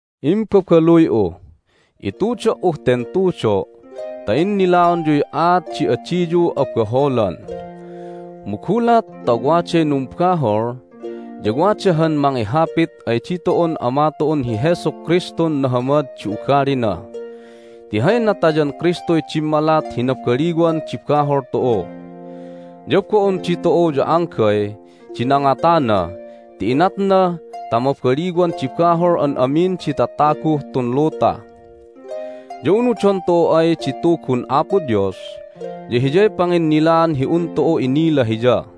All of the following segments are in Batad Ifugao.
Imbabaluy'u, itudo"uh ten tudo' ta innilaonyuy aat di adiyu abaholan. Mu gulat ta waday numbahol ya wada han mangihapit ay ditu'un Ama tu'un hi Jesu Kristun nahamad di ugalina. Ti hay natayan Kristuy dimmalat hi nabaliwan di bahol tu'u, ya bo'on ditu'u ya anggay di nangatana ti inatna ta mabaliwan di bahol an amin di tataguh tun luta. Ya unudon tu'u ay di Tugun Apo Dios ya hiyay panginnilaan hi un tu'u inila Hiya.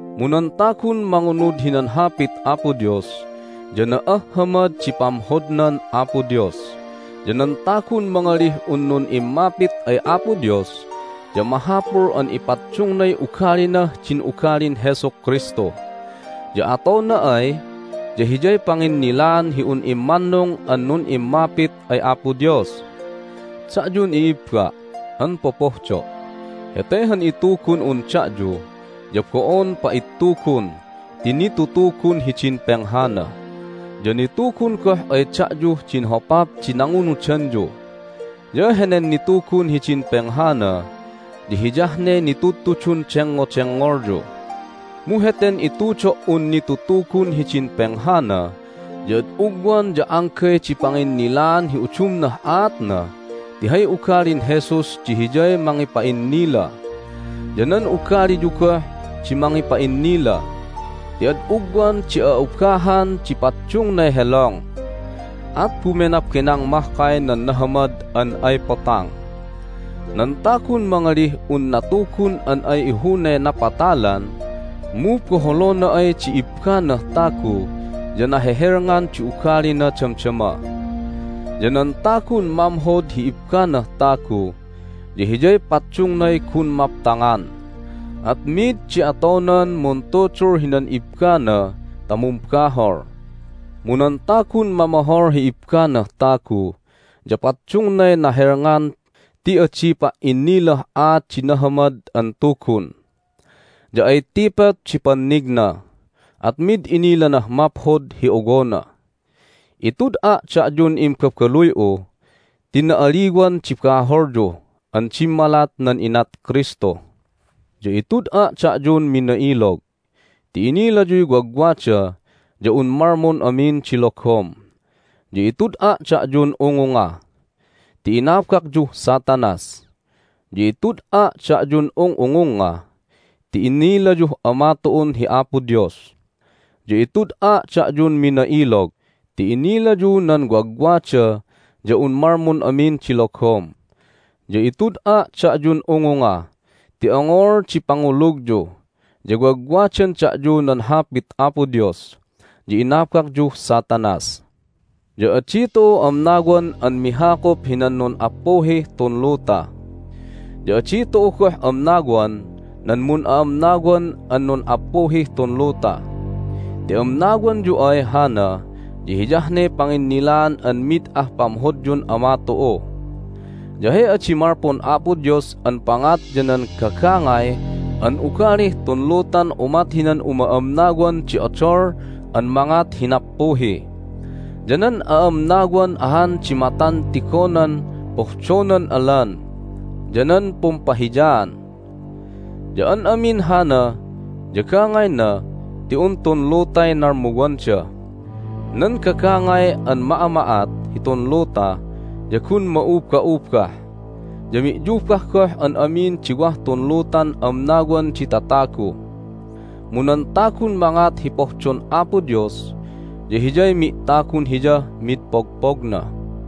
Mu nan tagun mangunud hinan Hapit Apo Dios ya na'ahhamad di pamhodnan Apo Dios. Ya nan tagun mangalih un nun'immapit ay Apo Dios ya mahapul an ipaddungnay ugalinah din ugalin Jesu Kristu, ya atona ay ya hiyay panginnilaan hi un immannung an nun'immapit ay Apo Dios. Da'yun i'ibba' an popohdo', hete han itugun'un da'yu ya bo'on pa'ittugun ti nitutugun hidin penghana, ya nitugun goh ay da'yuh din hopap di nangunudanyu. Ya henen nitugun hidin penghana ya hiyah ne nitudtudun dengngodengngolyu. Mu heten itudo"un nitutugun hidin penghana ya ad ugwan ya anggay di panginnilaan hi udumnah aatna ti hay ugalin Jesus di hiyay mangipa'innila, ya nan ugaliyu goh di mangipa'innila. Ti ad ugwan di a'ubahan di paddungnay helong, at bumenabenang mahkay nan nahamad an ay potang. Nan tagun mangalih un natugun an ay ihunay napatalan mu boholona ay di ibbanah tagu ya nahehelngan di ugalina damdama. Ya nan tagun mamhod hi ibbanah tagu ya hiyay paddungnay gun maptangan, at mid di atonan muntudul hinan ibbana ta mumbahol. Mu nan tagun mamohol hi ibbanah tagu ya paddungnay nahelngan ti adi pa"innilah aat di Nahamad an Tugun, ya ay tipot di pannigna, at mid inilanah maphod hi owona. Itud'a' da'yun imbabaluy'u ti na'aliwan di baholyu an dimmalat nan inat Kristu. Ya itud'a' da'yun mina'ilog ti inilayuy wagwada ya un malmun amin di logom. Ya itud'a' da'yun ungunga ti inabakyuh Satanas, ya itud'a' da'yun ung'ungungnga ti inilayuh Ama tu'un hi Apo Dios. Ya itud'a' da'yun mina'ilog ti inilayu nan wagwada ya un malmun amin di logom. Ya itud'a' da'yun ungunga ti ongol di pangulugyu, ya wagwadan da'yu nan Hapit Apo Dios, ya inabakyuh Satanas. Ya adi tu'u amnawan an mihakup hinan nun'appuhih tun luta, ya adi tu'u goh amnawan nan mun'a'amnawan an nun'appuhih tun luta. Ti amnawanyu ay hana ya hiyah ne panginnilaan an mid ah pamhodyun Ama tu'u. Ya hay adi malpun Apo Dios an pangat ya nan gagangay an ugalih tun lutan umat hinan uma'amnawan di odol an mangat hi nappuhi, ya nan a'amnawan ahan di matan tigonan pohdonan alan, ya nan pumpahiyaan. Ya an amin hana ya gangayna ti un tun lutay nalmuwanda. Nan gagangay an ma'ama'at hitun luta ya gun ma'uba'ubah, ya mi'yubah goh an amin di wah tun lutan amnawan di tatagu. Mu nan tagun mangat hi pohdon Apo Dios ya hiyay mi'tagun Hiyah mid pogpogna.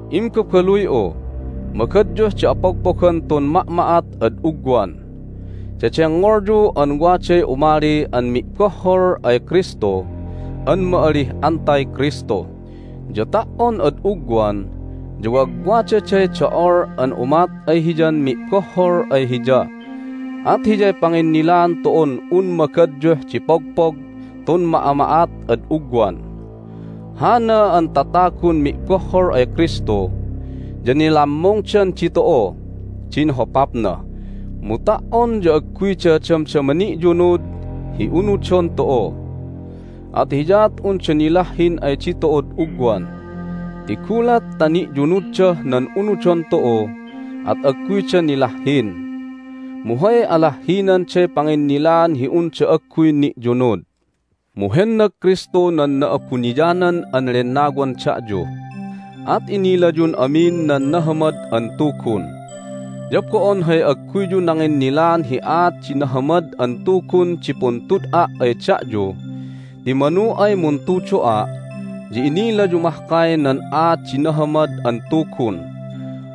Imbabaluy'u, magadyuh di apogpogan tun ma'ma'at ad ugwan! Dedengngolyu an waday umali nan Mi'bohhol ay Kristu an ma'alih AntiKristu, ya ta"on ad ugwan ya wagwadaday do'ol an umat ay hiyan mi'bohhol ay Hiya. At hiyay panginnilaan tu'un un magadyuh di pogpog tun ma'ama'at ad ugwan. Hana nan tatagun mi'bohhol ay Kristu ya nilammungdan ditu'uh din hopapna, mu ta"on ya agguyda damdama ni'yunud hi unudon tu'u, at hiyaat unda nilahhin ay ditu'ud ugwan. Ti gulat ta ni'yunuddah nan unudon tu'u at agguyda nilahhin, mu hay alahhinanday panginnilaan hi unda agguy ni'yunud. Mu hennag Kristu nan Na'abuniyanan an Lennawan da'yu, at inilayun amin nan Nahamad an Tugun. Ya bo'on hay agguyyu nanginnilaan hi aat di Nahamad an Tugun di puntud'a' ay da'yu ti manu ay muntudo'a' ya inilayu mahkay nan aat di Nahamad an Tugun,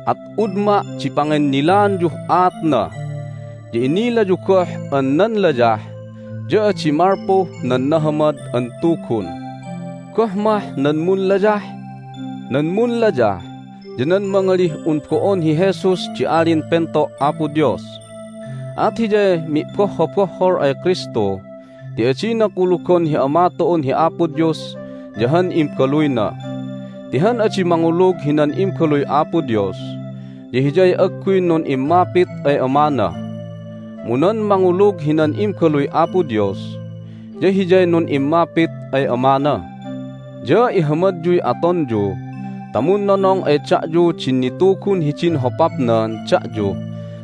at udma' di panginnilaanyuh aatna. Ya inilayu goh an nan layah ya adi malpuh nan Nahamad an Tugun. Goh mah nan munlayah? Nan munlayah ya nan mangalih un bo'on hi Jesus di Alin Pento' Apo Dios. At hiyay mi'bohhobohhol ay Kristu ti adina kulugon hi Ama tu'un hi Apo Dios ya han Imbaluyna. Ti han adi mangulug hinan Imbaluy Apo Dios ya hiyay agguy nun'immapit ay Amana, mu nan mangulug hinan Imbaluy Apo Dios ya hiyay nun'immapit ay Amana. Ya ihamadyuy atonyu ta munnonong ay da'yu din nitugun hidin hopapnan da'yu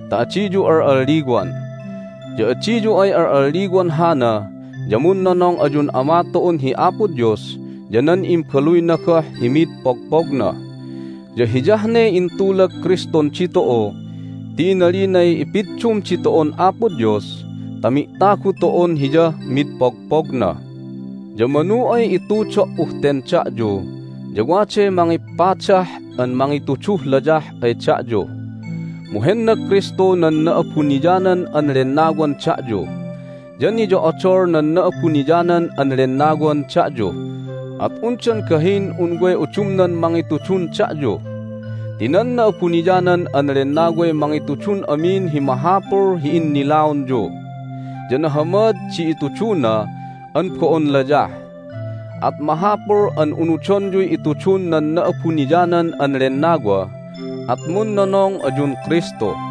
ta adiyu al'alliwan. Ya adiyu ay al'alliwan hana ya munnonong ayun Ama tu'un hi Apo Dios ya nan Imbaluyna goh hi mid pogpogna. Ya hiyah ne intulag Kristun ditu'u ti inalinay ipiddum ditu'un Apo Dios ta mi'tagu tu'un Hiyah mid pogpogna. Ya manu ay itudo"uh ten da'yu ya waday mangipadah an mangituduh layah ay da'yu. Mu hennag Kristu nan Na'abuniyanan an Lennawan da'yu, ya niyo'odol nan Na'abuniyanan an Lennawan da'yu, at undan gahin un way udumnan mangitudun da'yu. Ti nan Na'abuniyanan an Lennaway mangitudun amin hi mahapul hi innilaonyu, ya nahamad di ituduna an bo'on layah. At mahapul an unudonyuy itudun nan Na'abuniyanan an Lennawa, at munnonong ayun Kristu.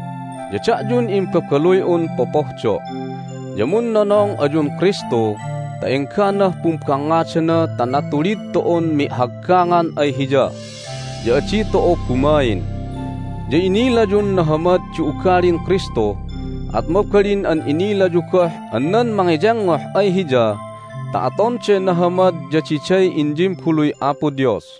Ya da'yun imbabaluy'un popohdo' ya munnonong ayun Kristu ta engganah pumbangngadana ta natulid tu'un mi'haggangan ay Hiya, ya adi tu'u bumain. Ya inilayun nahamad di ugalin Kristu, at mabalin an inilayu goh an nan mangiyengngoh ay Hiya ta atonday nahamad ya diday inyimbaluy Apo Dios.